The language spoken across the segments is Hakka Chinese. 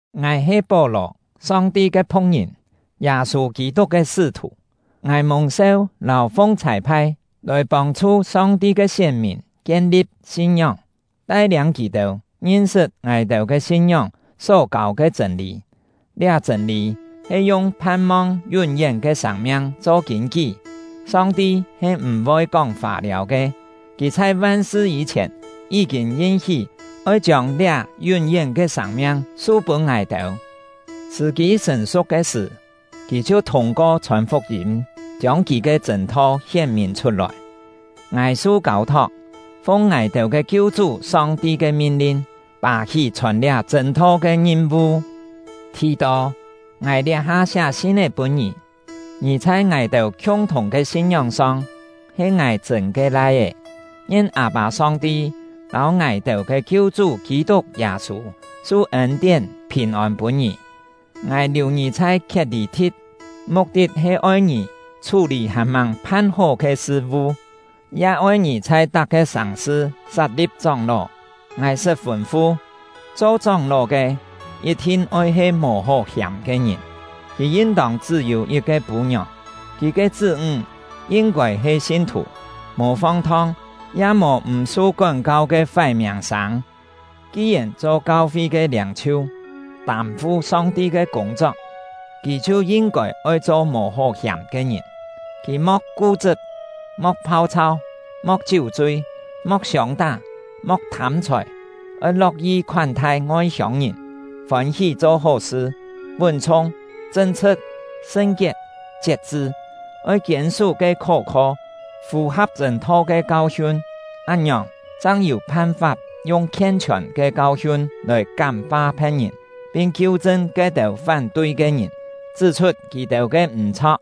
Ngài he Pó-lò, Song-ti ke phu̍k-ngìn, Yâ-sû Kî-tuk ke sṳ́-thù. Ngài mùng-seu lâu fung chhâi-phai lòi pông-chhu Song-ti ke sién-mìn kien-li̍p sin-ngióng, tai-liâng kì-têu ngin-sṳt ngài-têu ke sin-ngióng só kâu ke chṳ̂n-lî; liá chṳ̂n-lî he yung phan-mong yún-yén ke sâng-miang cho kîn-kí. Song-ti he m̀-voi kóng fâ-liâu ke! Kì chhai van-sṳ yî-chhièn, yí-kîn yin-hí oi chiông liá yún-yén ke sâng-miang su-pûn ngài-têu, sṳ̀-kî sṳ̀n-su̍k ke sṳ̀, Kì chhiu thûng-ko chhòn fuk-yîm chiông Kì ke chṳ̂n-tho hién-mìn chhut-lòi. Ngài su kâu-thok, fung ngài-têu ke Kiu-chú Song-ti ke min-lin, pà-hí chhòn liá chṳ̂n-tho ke ngim-vu. Thì-tô, ngài liá-ha siá sin-é pûn ngì; ngì chhai ngài-têu khiung-thùng ke sin-ngióng-song he ngài chṳ̂n ke lai-é. Ngien Â-pâ Song-ti lâu ngài-têu ke Kiu-chú Kî-tuk Yâ-sû su ên-tién, phìn-ôn pûn ngì! Ngài liù ngì chhai Khiet-lî-thi̍t, muk-tit he oi ngì chhú-lî hàn-màng phan-hó ke sṳ-vu, ya oi ngì chhai tak-ke sàng-sṳ sat-li̍p chóng-ló. Ngài sṳt fûn-fu: Cho chóng-ló ke yit-thin oi he mò hó hiàm ke ngìn. Kì yin-tông chṳ́-yû yit-ke pû-ngiòng “chṳ́-yû yit-ke pû-ngiòng” ya-he yi̍t-cho “chṳ́-yû kiet-fûn yit-pái”.; kì ke chṳ́-ńg yin-kôi he sin-thù, mò fong-thong ya mò m̀-su kón-kau ke fái miàng-sâng. Ki-yèn cho kau-fi ke liâng-chhiu “cho kau-fi ke liâng-chhiu” ya-he yi̍t-cho “kam-tuk”. tâm-fu Song-ti ke kûng-chok, kì chhiu yin-kôi oi cho mò hó hiàm ke ngìn. Kì mo̍k ku-chṳp, mo̍k phau-chhau, mo̍k chiú-chui, mo̍k siông-tá, mo̍k thâm-chhòi; oi lo̍k-yi khoán-thai ngoi-hiông-ngìn, fôn-hí cho hó-sṳ, vún-chhung, chṳn-chhṳ̍t, sṳn-kiet, chiet-chṳ. Oi kiên-sú ke khó-kho, fù-ha̍p chṳ̂n-tho ke kau-hiun; án-ngiòng, chang yû phan-fap yung khien-chhiòn ke kau-hiun lòi kám-fa phe̍t-ngìn, pin kiu-chṳn ke-têu fán-tui ke ngìn, chṳ́-chhut kì-têu ke m̀-chho̍k.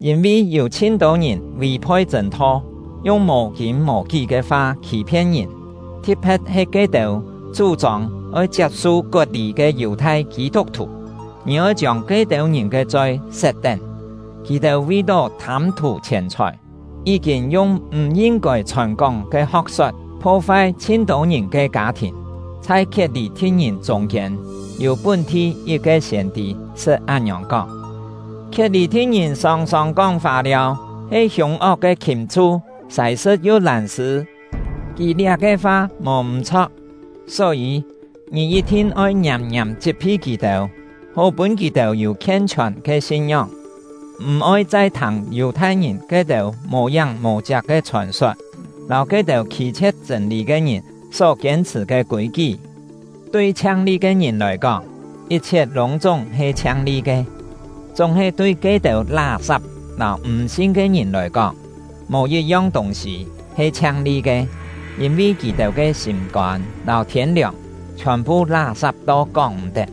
Yîn-vi yû chhin-tô ngìn vì-phoi chṳ̂n-tho, yung mò-kîn-mò-kí ke fa khî-phien ngìn, thi̍t-phe̍t he ke-têu chú-chông oi chiap-su kot-lî ke Yù-thai Kî-tuk-thù. Ngì oi chiông ke-têu ngìn ke choi set-tén; kì-têu vi-tó thâm-thù chhièn-chhòi, yí-kîn yung m̀ yin-kôi chhòn-kóng ke ho̍k-sot pho-fai chhin-tô ngìn ke kâ-thìn. Chhai Khiet-lî-thi̍t-ngìn chûng-kiên, yû pún-thi yit-ke siên-tî sṳt án-ngiòng kóng: “Khiet-lî-thi̍t-ngìn sòng-sòng kóng fâ-liâu, he hiûng-ok ke khìm-chhu, sài-sṳ̍t yu lân-sṳ̂.” Kì liá-ke fa mò m̀-chho̍k. Só-yî, ngì yit-thin oi ngiàm-ngiàm chit-phi kì-têu, hó pûn kì-têu yû khien-chhiòn ke sin-ngióng, m̀-oi chai thâng Yù-thai-ngìn ke-têu mò-yáng mò-chiak ke chhòn-sot, lâu ke-têu khî-chhie̍t chṳ̂n-lî ke ngìn só kiên-chhṳ̀ ke kûi-kí. Tui chhiang-li ke ngìn lòi kóng, yit-chhiet lûng-chúng he chhiang-li ke; chúng-he tui ke-têu lá-sap lâu m̀-sin ke ngìn lòi kóng, mò yit-yong tûng-sî he chhiang-li ke, yîn-vi kì-têu ke sîm-kôn lâu thiên-liòng chhiòn-phu lá-sap to kóng-m̀-tet.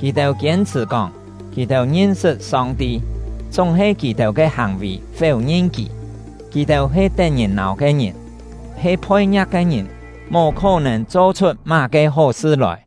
Kì-têu kiên-chhṳ̀ kóng kì-têu ngin-sṳt Song-ti; chúng-he kì-têu ke hàng-vì féu-ngin Kì. Kì-têu he tet-ngìn-nâu ke ngìn, he phoi-ngia̍k ke ngìn, mò khó-nèn cho-chhut má-ke hó-sṳ lòi!